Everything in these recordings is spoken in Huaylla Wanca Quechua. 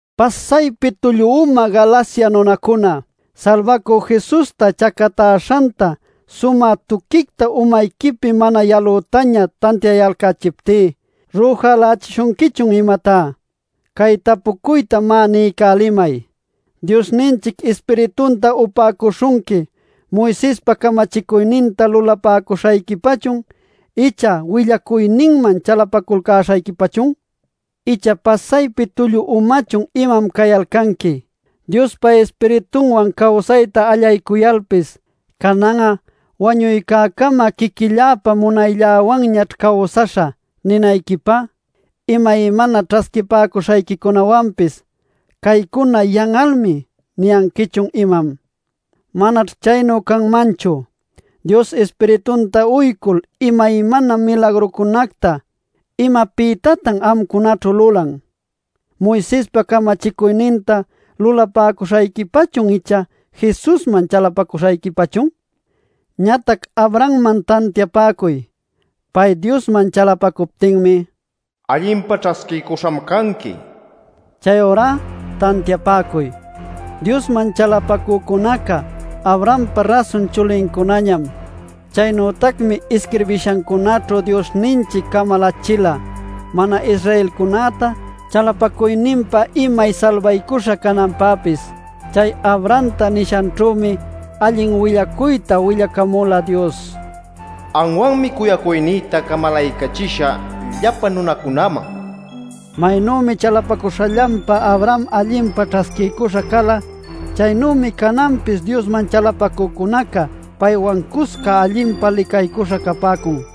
¡Pasaypi tullu umayu Galacia nunacuna! Salbacü Jesusta chacatäśhanta sumä tuquicta umayquipi mana yalütaña tantiayalcächiptí ¿rüjalächishunquichun imatá? Cay tapucuyta, má, niycälimay: ¿Diosninchic Ispiritunta upäcuśhunqui Moisespa camachicuyninta lulapäcuśhayquipachun, icha willacuyninman chalapaculcäśhayquipachun? ¿Icha pasaypi tullu umachun imam cayalcanqui “Diospa Ispiritunwan cawsayta allaycuyalpis, canan'a wañuycäcama quiquilläpa munaylläwanñaćh cawsaśhä” ninayquipä? Imaymana ćhasquipäcuśhayquicunäwanpis ¿“Caycuna yan'almi” niyanquichun, imam? Manaćh chaynu canmanchu. Dios Ispiritunta uycul imaymana milagrucunacta ¿imapïtatan amcunaćhu lulan? ¿Moisespa camachicuyninta lulapäcuśhayquipachun icha Jesusman chalapaculcäśhayquipachun? Ñatac Abrahamman tantiapäcuy. Pay, Diosman chalapacuptinmi: “Allinpa ćhasquiycuśham canqui” nila. Chayurá tantiapäcuy: Diosman chalapacücunaca Abrahampa rasun chulincunañam. Chaynütacmi isquirbishancunaćhu Diosninchic camalachila mana-Israelcunäta chalapacuyninpa imay salbaycuśha cananpäpis. Chay Abrahamta nishanćhümi allin willacuyta willacamula Dios: “Anwanmi cuyacuynïta camalaycachisha llapa nunacunäman” nil nishanwan. Maynümi chalapacuśhanpa Abraham allinpa ćhasquiycuśha cala, chaynümi cananpis Diosman chalapacücunaca paywan cusca allinpa licaycuśha capäcun.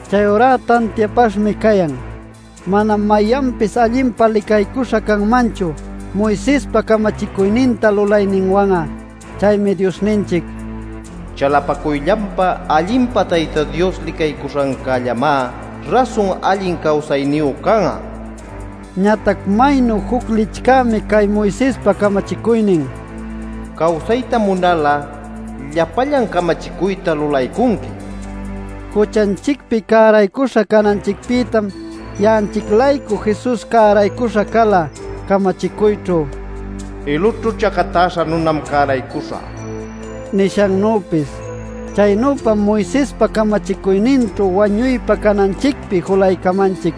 Chayurá tantiapaśhmi cayan: manam mayanpis allinpa licaycuśha canmanchu Moisespa camachicuyninta lulayninwan'a. Chaymi Diosninchic “Chalapacuyllanpa allinpa Tayta Dios licaycuśhancällamá rasun allin cawsayniyu can'a” niyan. Ñatac maynu juc licchämi cay Moisespa camachicuynin “Cawsayta munal'a llapallan camachicuyta lulaycunqui” nil nishancá. Juchanchicpi cäraycuśha cananchicpïtam ya'anchic-laycu Jesus cäraycuśha cala, camachicuyćhu “ilućhu chacatäśha nunam cäraycuśha” nishannüpis. Chaynüpam Moisespa camachicuyninćhu wañuypa cananchicpi julaycamanchic.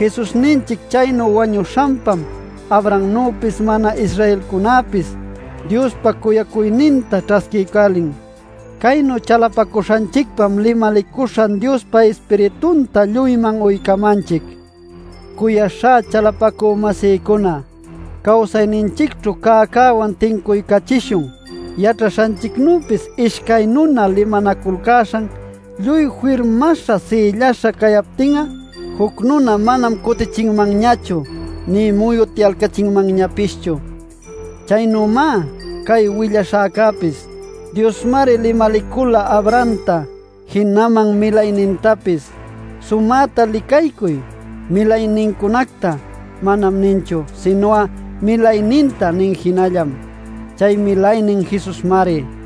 Jesusninchic chaynu wañuśhanpam Abrahamnüpis mana-Israelcunäpis Diospa cuyacuyninta ćhasquiycälin. Caynu chalapacuśhanchicpam limalicuśhan Diospa Ispiritunta lluyman uycamanchic. Cuyaśhá chalapacü-masïcuna, cawsayninchicćhu cäcäwan tincuycachishun. Yaćhaśhanchicnüpis ishcay nuna limanaculcäśhan lluy firmaśha sïllaśha captin'a juc nuna manam cutichinmanñachu nï muyutyalcachinmanñapischu. Chaynümá cay willaśhäcäpis. Diosmari limalicula Abrahamta jinaman milaynintapis. Sumäta licaycuy “milaynincunacta” manam ninchu, sinu'a “milayninta” nin jinallam. Chay milaynin Jesusmari.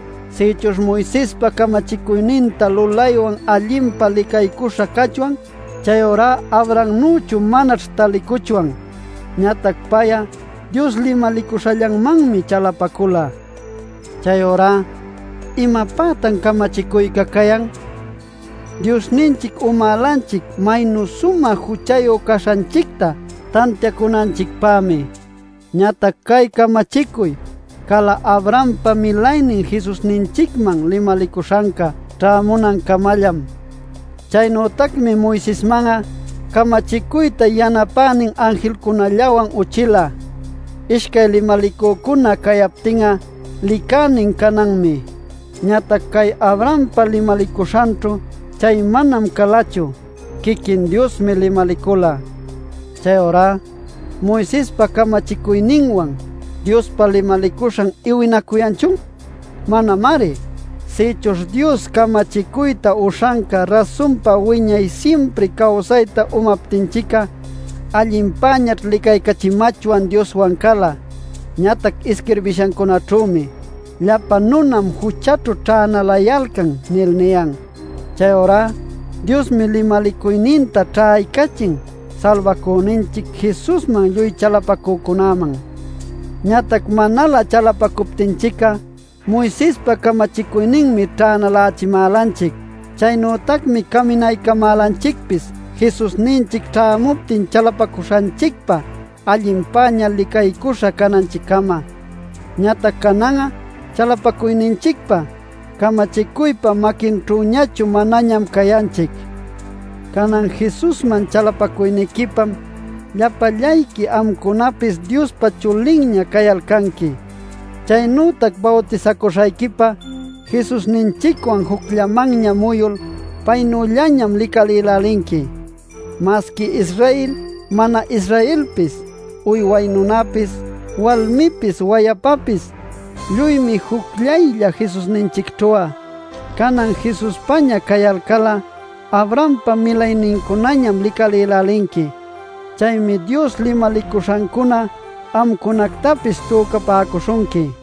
Sïchuśh Moisespa camachicuyninta lulaywan allinpa licaycuśha cachwan, chayurá Abrahamnüchu manaćh taliycuchwan. Ñatac pay'a Dios limalicuśhallanmanmi chalapacula. Chayurá ¿imapätan camachicuyca cayan? Diosninchic umälanchic maynu sumä juchayu caśhanchicta tantiacunanchicpämi. Ñatac cay camachicuy cala Abrahampa milaynin Jesusninchicman limalicuśhanca ćhämunancamallam. Chaynütacmi Moisesman'a camachicuyta yanapänin anjilcunallawan uchila. Ishcay limalicücuna cayaptin'a licänin cananmi. Ñatac cay Abrahampä limalicuśhanćhu chay manam calachu; quiquin Diosmi limalicula. Chayurá ¿Moisespa camachicuyninwan Diospa limalicuśhan iwinacuyanchun? ¡Manamari! Sïchuśh Dios camachicuyta uśhanca rasunpa wiñay simpri cawsayta umaptinchic'a allinpäñaćh licaycachimachwan Dioswan cala. Ñatac isquirbishancunaćhümi: “Llapa nunam juchaćhu ćhänalayalcan” nil niyan. Chayurá Diosmi limalicuyninta ćhaycachin Salbacüninchic Jesusman lluy chalapacücunäman. Ñatac manalä chalapacuptinchic'a Moisespa camachicuyninmi ćhänalächimälanchic. Chaynütacmi caminaycamälanchicpis Jesusninchic ćhämuptin chalapacuśhanchicpa allinpäña licaycuśha cananchiccama. Ñatac canan'a chalapacuyninchicpa camachicuypa maquinćhüñachu manañam cayanchic. Canan Jesusman chalapacuyniquipam llapallayqui amcunapis Diospa chulinña cayalcanqui. Chaynütac bawtisacuśhayquipa Jesusninchicwan jucllamanña muyul paynüllañam licalïlälinqui. Masqui Israel, mana-Israelpis, uyway nunapis, walmipis, wayapapis, lluymi jucllaylla Jesusninchicćhu'a. Canan Jesuspaña cayalcal'a, Abrahampa milaynincunañam licalïlälinqui. Chaymi Dios limalicuśhancuna amcunactapis tücapäcuśhunqui.